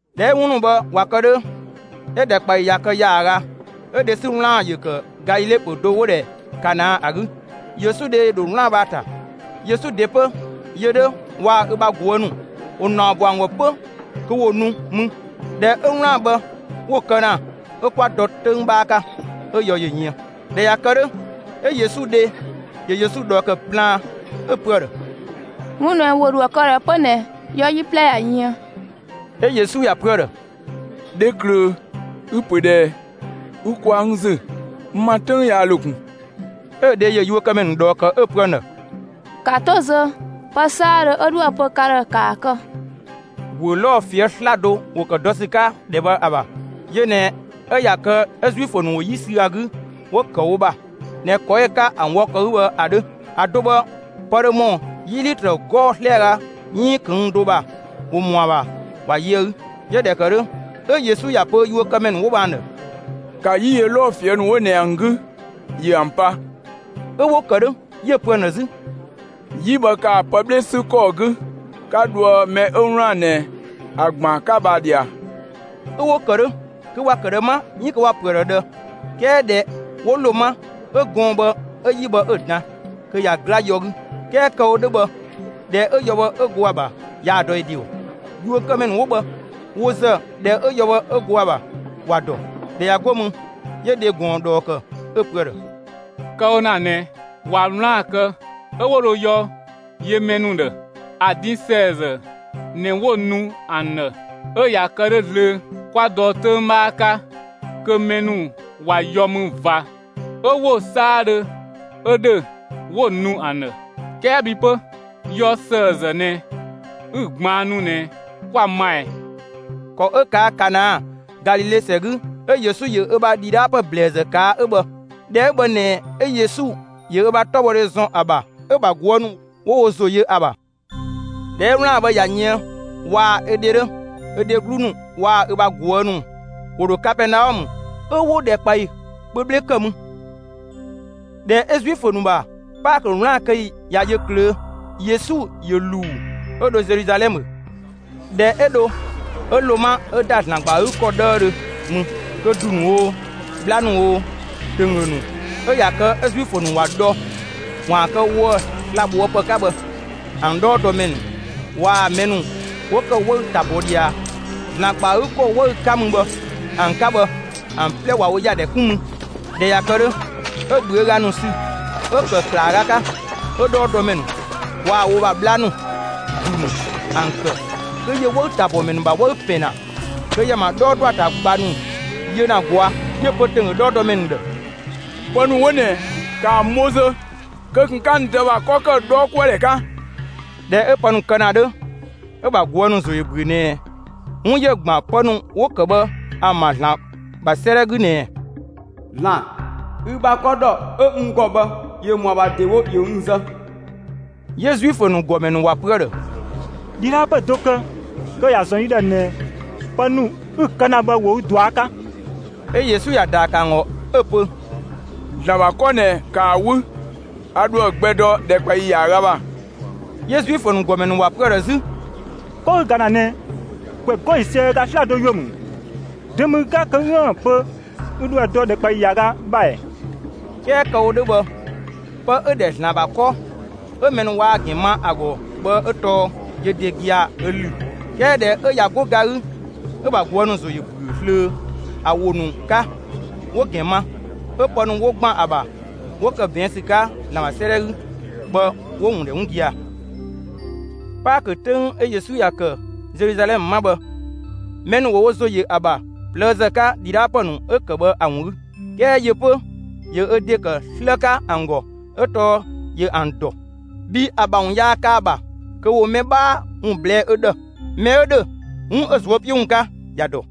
꞊Dhɛ 'ö 'wun ‑nu bhë ꞊wa kë 'dhö, 'ö‑ ‑dhɛkpaɔyi ꞊ya kë ‑yaaga, 'ö dhe 'sü 'wlaan‑ ‑yö ‑kë Galile pö‑ do 'wo‑ ‑dhɛ Kana ‑a 'gü. Yesu dhe ‑yö ‑dho 'wlaan‑ bhë ‑a ‑ta. Yesu ‑de 'pö, yö 'dhö waa‑ ö ‑bha ꞊guë' ‑nu, ‑wo ‑naɔ ‑bɔ ‑an ‑gɔ 'pö kö ‑wo nu mü. ꞊Dhɛ 'ö 'wlaan‑ bhë 'wo‑ kë ‑na, 'ö kwa dɔ 'töng 'bhaa 'ka, 'ö yɔ ‑yö yën. ꞊Dhɛ ꞊ya kë 'dhö, 'ö Yesu dhe ‑yö Yesu ꞊dhɔɔ ‑kë plaan, 'ö‑ pö ‑a ‑dhë: «'Wun ꞊nɛ ‑wo ‑dho ‑a kë ꞊dhë 'pö ꞊nɛ! Yɔ 'yi 'plɛ ꞊ya yën.» 'Ö Yesu ‑ya pö ‑a ‑dhë: «Dheklöö, ü‑ ‑pö ꞊dhɛɛ? Ü ꞊kwaa' n ‑zü. N ‑ma 'töng yaa ‑lo ꞊kun!» 'Ö‑ dhe ‑yö yuökëmɛ ‑nu ꞊dhɔɔ ‑kë 'ö‑ pö ‑an ‑dhë: «‑Ka 'to zö; pë 'saadhö 'ö 'dhoë‑ pö ka ‑dhë, ‑kaa kë!» ‑Guö 'lɔɔ‑ ꞊fië' 'slado ‑wo ‑kë dɔ ‑sü 'ka ‑dhɛ bhë ‑a ‑bha. Yö ꞊nɛ 'ö ꞊ya kë 'ö Zuifö ‑wo 'yi sü ‑a 'gü 'wo‑ ‑kë wo ‑bha ꞊nɛ ‑kɔ 'ö‑ 'ka ‑an wɔ ‑kɔ 'gü bhë ‑a 'dhö. ‑A do bhë pë dhö ‑mɔ 'yi 'litrö 'gɔɔ‑ 'slɛaga 'iin ꞊këng' do ‑bha ‑wo ‑mɔ ‑a ‑bha ‑wa yö ‑a 'gü. 'Yö ꞊dhɛ ‑kë 'dhö 'ö Yesu ‑ya pö yuökëmɛ ‑nu 'wo bhë ‑an ‑dhë: «‑Ka 'yi yö 'lɔɔ‑ ꞊fië' ‑nu 'wo ꞊nɛ ‑an 'gü, ‑yö ‑an pa!» 'Ö 'wo‑ ‑kë 'dhö. 'Yö‑ pö ‑an ‑dhë 'zü: «'Yi bhë ‑kaa pë 'bhle 'sü ‑kɔɔ 'gü 'ka dhoë mɛ 'ö 'wlaan‑ ꞊nɛ ‑a ‑gbaan 'ka bhë, ‑a ꞊dhia!» 'ö 'wo‑ ‑kë 'dhö. (Kö ‑wa ‑kë ꞊dhë 'ma, 'iin kö ‑wa ‑pö ‑a ‑dhë ꞊dhë, 'kɛɛ) ꞊dhɛ 'wo ‑lo 'ma 'ö gɔɔn‑ bhë 'ö 'yi bhë 'ö‑ dan, kö ꞊ya 'gla yɔ 'gü. 'Kɛɛ kë‑ wo 'dhö bhë, ‑dhɛ 'ö yɔ bhë 'ö go ‑a ‑bha yaa‑ dɔ ö ‑de ‑gɔ. Yuökëmɛ ‑nu 'wo bhë, wo ‑zë ꞊dhɛ 'ö yɔ bhë 'ö go ‑a ‑bha ‑wa ‑dɔ. ꞊Dhɛ ꞊ya 'go mü, 'yö dhe ꞊gɔn ꞊dhɔɔ ‑kë 'ö‑ pö ‑a ‑dhë: «Kë‑ wo ‑na ꞊nɛ, ꞊wa 'wlaan‑ kë 'ö 'wo dho yɔ yö mɛ ‑nu ‑dhë, ‑a din ‑sëëzë ꞊nɛ 'wo‑ nu ‑an ‑dhë, 'ö ꞊ya kë 'dhö zlöö, 'kwa dɔ 'töng 'bhaa 'ka kö mɛ ‑nu ꞊wa yɔ mü ꞊va 'ö 'wo‑ 'saadhö 'ö ‑dhö, 'wo‑ nu ‑an ‑dhë; 'kɛɛ bhi 'pö, yɔ ‑sëëzë ꞊nɛ 'ü‑ ꞊gbaannu ꞊nɛ, 'kwa‑ ma ꞊ɛɛ?» ‑Kɔ 'ö ꞊kaa' Kana, Galile ‑sɛ 'gü, 'ö Yesu ‑yö ö ‑bha ‑dhidhaapë ‑blɛɛzë ꞊kaa' 'ö bhë. ꞊Dhɛ 'ö bhë ꞊nɛ 'ö Yesu ‑yö ö ‑bha 'tɔbhɔdhe ‑zɔn ‑a ‑bha, 'ö‑ ‑bha ꞊guë' ‑nu ‑wo wo ‑zo yö ‑a ‑bha. ꞊Dhɛ 'ö 'wlaan‑ bhë ꞊ya yën, waa‑ ö dhe 'dhö, 'ö dheglu ‑nu waa‑ ö ‑bha ꞊guë' ‑nu ‑wo ‑dho Kapɛɛnaɔmë 'ö 'wo ‑dhɛkpaɔyi kpö 'bhle kë mü. ꞊Dhɛ 'ö Zuifö ‑nu ‑bha Paakö 'wlaan‑ kë ‑yi ꞊ya yö ꞊klöö', Yesu ‑yö ‑luu 'ö dho Zeluzalɛmë. ꞊Dhɛ 'ö dho, 'ö ‑lo 'ma ('ö ‑da ‑Zlan ‑gba ‑a 'gü ‑kɔ 'dhëüdhö mü), kö ‑du ‑nu oo, 'bhla ‑nu oo, ‑tönggö ‑nu ('ö ꞊ya kë 'ö Zuifö ‑nu ‑wa dhɔ ‑waan kë woë‑ sla‑ ꞊bhoë' ‑pë 'ka bhë) ‑an 'dhɔɔdɔmɛ ‑nu waa‑ mɛ ‑nu 'wo ‑kë 'wëü‑ ‑ta ‑bɔ ꞊dhia ‑Zlan ‑gba ‑a 'gü ‑kɔ 'wëü‑ 'ka mü bhë ‑an 'ka bhë ‑an 'plɛ ꞊wa wo ‑yadhɛ 'kun mü. ꞊Dhɛ ꞊ya kë 'dhö, 'ö ꞊bhüöga ‑nu sü 'ö‑ ‑kë ‑klaaga 'ka, 'ö 'dhɔɔdɔmɛ ‑nu waa‑ wo ‑bha 'bhla ‑nu, ‑du ‑nu ‑an ‑kë; kö ‑yö 'wëü‑ ‑tabhɔmɛ ‑nu ‑bha 'wëü‑ ‑pɛn ‑na kö ‑yö ‑an ‑bha 'dhɔɔ dɔ ‑a ‑ta ꞊gba ‑nu yö ‑na ꞊gɔa'. 'Yö‑ pö ‑tönggö 'dhɔɔdɔmɛ ‑nu ‑dhë: «Pë ‑nu 'wo ꞊nɛ, ‑ka ‑an bho zö; kö ꞊kun 'ka n Dë ‑bha 'kɔ kë 'dhɔɔkuëdhɛ 'ka.» ꞊Dhɛ 'ö pë ‑nu kë ‑na 'dhö, 'ö‑ ‑bha ꞊guë' ‑nu ‑zo ‑yö ‑büö ꞊nɛ 'wun ‑yö ‑gban pë ‑nu 'wo ‑kë bhë ‑an ‑bha ‑Zlan ‑bha 'sëëdhɛ 'gü ꞊nɛɛ: «‑Zlan, ü ‑bha 'kɔ ‑dhɔ 'ö n ‑gɔ bhë ‑yö ‑mɔa ‑bha ‑dewo ‑yö n zë.» 'Yö Zuifö ‑nu ‑gɔmɛ ‑nu ‑wa pö ‑a ‑dhë: «‑Dhidhaapë do kë kö ‑ya ‑zɔn yi ‑dhë ꞊nɛ pë ‑nu 'ü‑ kë ‑na bhë ‑wo ü ꞊dua' 'ka.» 'Ö Yesu ‑ya ‑daa ‑kë ‑an ‑gɔ, 'ö‑ pö: «‑Zlan ‑bha 'kɔ ꞊nɛ, ‑kaa 'wü; a ‑dho ‑a gbɛ dɔ ‑dhɛkpaɔyi ‑yaaga ‑bha.» 'Yö Zuifö ‑nu ‑gɔmɛ ‑nu ‑wa pö ‑a ‑dhë 'zü: «'Kɔ ü ‑ga ‑na ꞊nɛ, ‑kwɛ 'gɔɔ‑ ‑yiisië ö ga 'slado ‑yuö ‑mü; dö ‑mü ü 'ka kö 'üën‑ pö yi ‑dhë ü ‑dho ‑a dɔ ‑dhɛkpaɔyi ‑yaaga ‑bha ‑ɛ?» 'Kɛɛ kë‑ wo 'dhö bhë, pë 'ö‑ ‑dhɛ ‑Zlan ‑bha 'kɔ ('ö mɛ ‑nu waa‑ ‑gɛn ma ‑a ‑gɔ) bhë 'ö tɔɔ yö ‑de gia‑ ö ‑lü. 'Kɛɛ ꞊dhɛ 'ö ꞊ya 'go ga 'gü, 'ö‑ ‑bha ꞊guë' ‑nu ‑zo ‑yö ‑büö zlöö ‑a ‑wo ‑nu 'ka, 'wo‑ ‑gɛn ma; 'ö pë ‑nu 'wo ‑gban ‑a ‑bha 'wo ‑kë ꞊bɛɛn' ‑sü 'ka ‑Zlan ‑bha 'sëëdhɛ 'gü bhë 'wo‑ ‑wun ‑dhɛ 'wun gia‑. Paakö 'töng 'ö Yesu ‑ya ‑kë Zeluzalɛmë 'ma bhë, mɛ ‑nu ‑wo wo ‑zo ‑yö ‑a ‑bha ꞊plëëzë 'ka ‑dhidhaapë ‑nu 'ö‑ ‑kë bhë ‑a ‑wun 'gü. 'Kɛɛ yö 'pö, ‑yö ö ‑de ‑kë 'slë 'ka ‑an ‑gɔ 'ö tɔɔ ‑yö ‑an ‑dɔ; bhii ‑a ‑bha ‑wun yaa kë ‑a ‑bha kö ‑wo mɛ 'bhaa ‑wun ꞊blɛɛ' ö ‑dhë. Mɛ 'ö ‑dhö 'wun 'ö‑ ꞊zuö' 'piö ‑wun 'ka, ‑ya ‑dɔ.